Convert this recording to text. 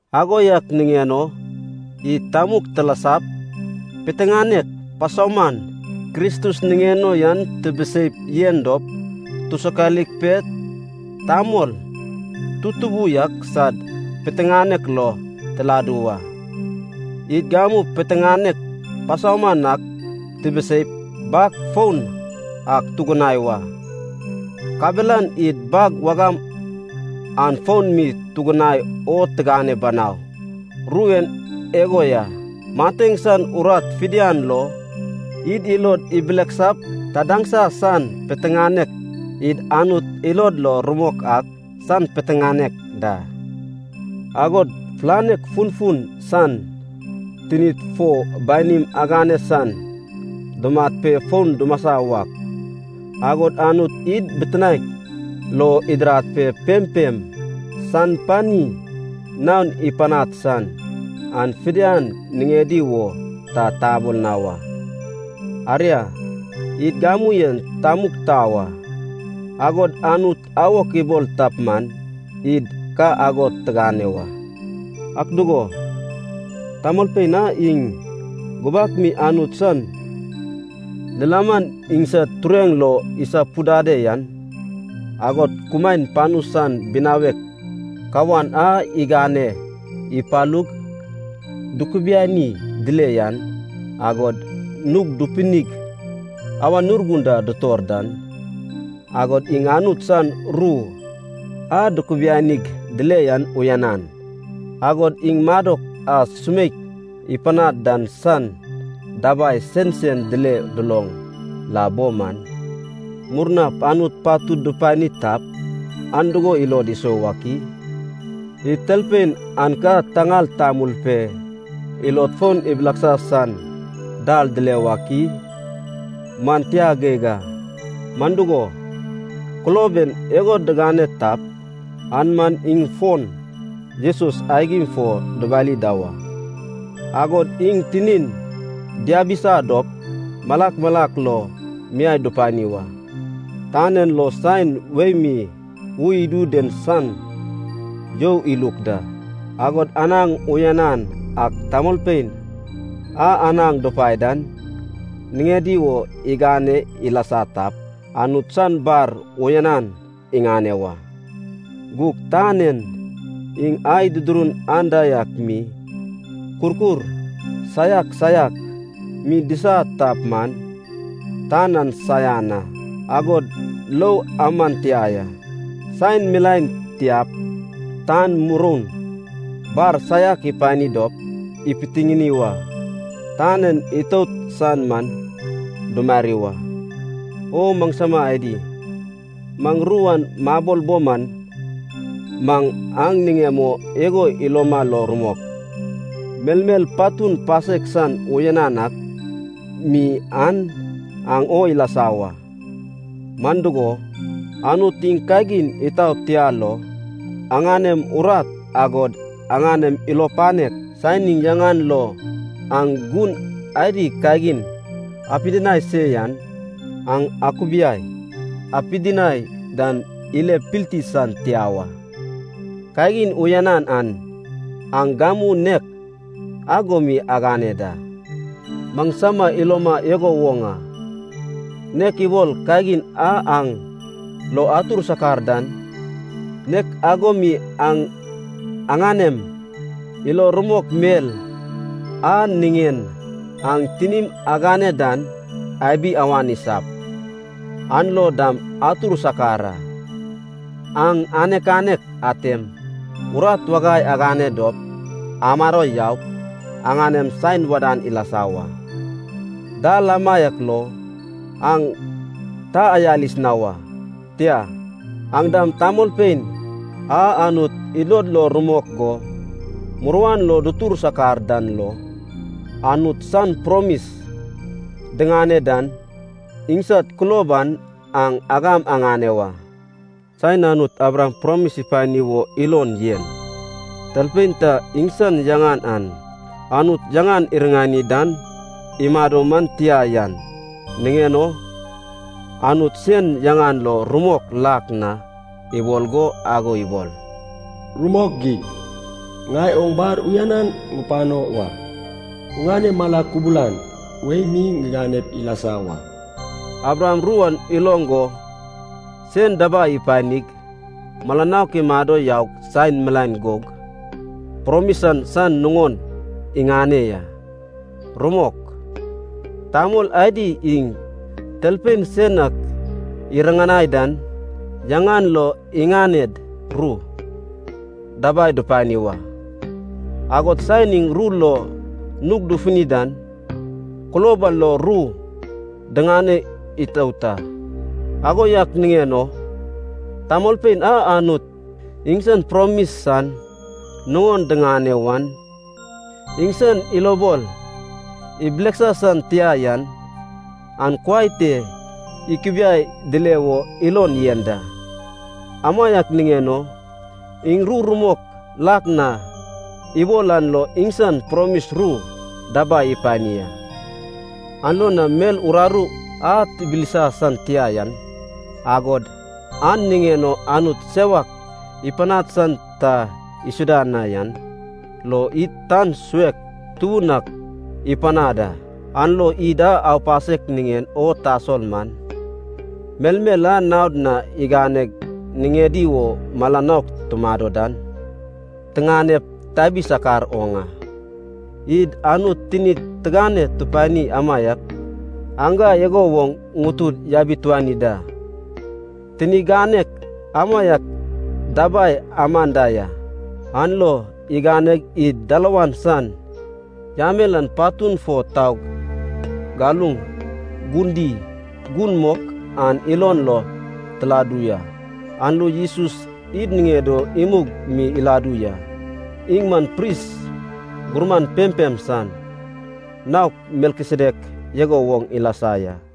Ago yak niŋen o id tamug tilasap, piteŋanek pasauman Kristus niŋen o yan tibiseip yen dop, tusokalik pe tamol tutubu yak sad piteŋanek lo tiladu wa. Id gamu piteŋanek pasauman ak tibiseip bag foun ak tugunai wa, kabelan id bag wagam an fon mi tugunai o tigane banau. Ru en igo ya, mateŋ san urat fidian lo id ilod ibileksap tadaŋsa san piteŋanek, id Anut ilod lo rumok ak san piteŋanek da, agod fulanek funfun san, tinid fo banim agane san, dumat pe fon dumasa wak, agod Anut id bitinaek lo idirad pe pempem san pani naon ipanad san, an fidian niŋedi wo ta tabol na wa. Aria, id gamu en tamug tau a, agod Anut awok ibol tap man, id ka ago tigane wa. Ak dugo, tamolpein a iŋ gubak mi Anut san lilaman iŋsad tureŋ lo isapudade yan, agod kumaen panu san binawek kawan a igane ipalug dukubiani dile yan, agod nug dupinig Awan Urgun da dutor dan, agod iŋ Anut san ru a dukubianig dile yan uyanan, agod iŋ madok a sumeik ipanad dan san dabai sensen dile duloŋ la bo man, murnap Anut patud dupani tap, an dugo ilod isou wak i? Id talpein an ka taŋal tamul pe ilod fon ibileksa san dal dile wak i? Man tia geig a! Man dugo, kulob en igo digane tap, an man iŋ fon Jesus aigim fo dubali da wa, agod iŋ tinin diabisa dop malak malak lo miai dupani wa. Tan en lo saen wei mi ui idu den san you iluk da, agod anaŋ uyanan ak tamolpein a anaŋ dupae dan niŋedi wo igane ilasa tap, Anut san bar uyanan iŋane wa. Gug tan en iŋ ai dudurun anda yak mi, kurkur saiak saiak mi disa tap man, tan an saian a, agod lou aman tia ya. Saen milaen tiap tan muroun bar saiak ipani dop ipitiŋini wa. Tan en itout san man dumari wa. O maŋsama adi, maŋ ru an mabol bo man, maŋ aŋ niŋem o igo iloma lo rumok. Melmel patun pasek san uyanan ak mi an, aŋ o ilasa wa. Man dugo, Anut iŋ kagin itaot tia lo, aŋanem urat agod aŋanem ilo panek, saen iŋ yaŋan lo aŋ gun adi kagin apidinai se yan, aŋ akubiai apidinai dan ile pilti san tia wa. Kagin uyanan an aŋ gamu nek ago mi agane da. Maŋsama iloma igo woŋ a. Nek ibol kagin a aŋ lo atur sakar dan, nek ago mi aŋ aŋanem ilo rumok mel a niŋen aŋ tinim agane dan abi awan isap, an lo dam atur sakar a. Aŋ anek anek atem urat wagai agane dop amado yaup aŋanem saen wadan ilasa wa. Dal amaiak lo aŋ ta ayalis na wa. Tia, aŋ dam tamolpein a Anut ilod lo rumok go, muruan lo dutur sakar dan lo, Anut san promis diŋane dan, iŋsad kulob an aŋ agam aŋane wa. Saen Anut Abraham promis ipani wo ilon yen, talpein ta iŋsan yaŋan an, Anut yaŋan iriŋani dan imado man tia yan niŋen o, Anut sen yaŋan lo rumok lak na ibol go ago ibol, “Rumok geig, ŋai oŋ bar uyanan ŋupano wa, oŋane mala kubalan wei mi ŋiganep ilasa wa.” Abraham ru an iloŋ go sen dabai ipanig, mala nouk imado yaug saen milaen gug promis an san nuŋon iŋane ya. Rumok, tamol adi iŋ talpein sen ak iriŋanai dan yaŋan lo iŋaned ru dabai dupani wa. Agod saen iŋ ru lo nug dufuni dan, kulob an lo ru digane itout a. Ago yak niŋen o tamolpein a Anut iŋsan promis san nuŋon diŋane wan, iŋsan ilobol ibileksa san tia yan, an kuai te ikubiai dile wo ilon yen da. Amaiak niŋen o iŋ ru rumok lak na ibol an lo iŋsan promis ru dabai ipani a. An lo na mel uraru a tibilsa san tia yan, agod an niŋen o Anut sewak ipanad san ta isuda na yan, lo id tan suek tubun ak ipanad a, an lo id a aupasek niŋen o tasol man, melmel a naod na iganeg niŋedi wo mala naok tumado dan, tiŋanep tabi sakar oŋ a. Id Anut tinid tigane tupanid amaiak aŋga igo woŋ ŋutud yabituani da. Tini ganek amaiak dabai aman da ya, an lo iganeg id dalawan san yamel an patun fo taug galuŋ Gun Di, Gun Mok an ilon lo tiladu ya. An lo Jesus id niŋed o imug mi iladu ya. Iŋ man pris gurman pempem san, naok Melkisedek igo woŋ ilasa ya.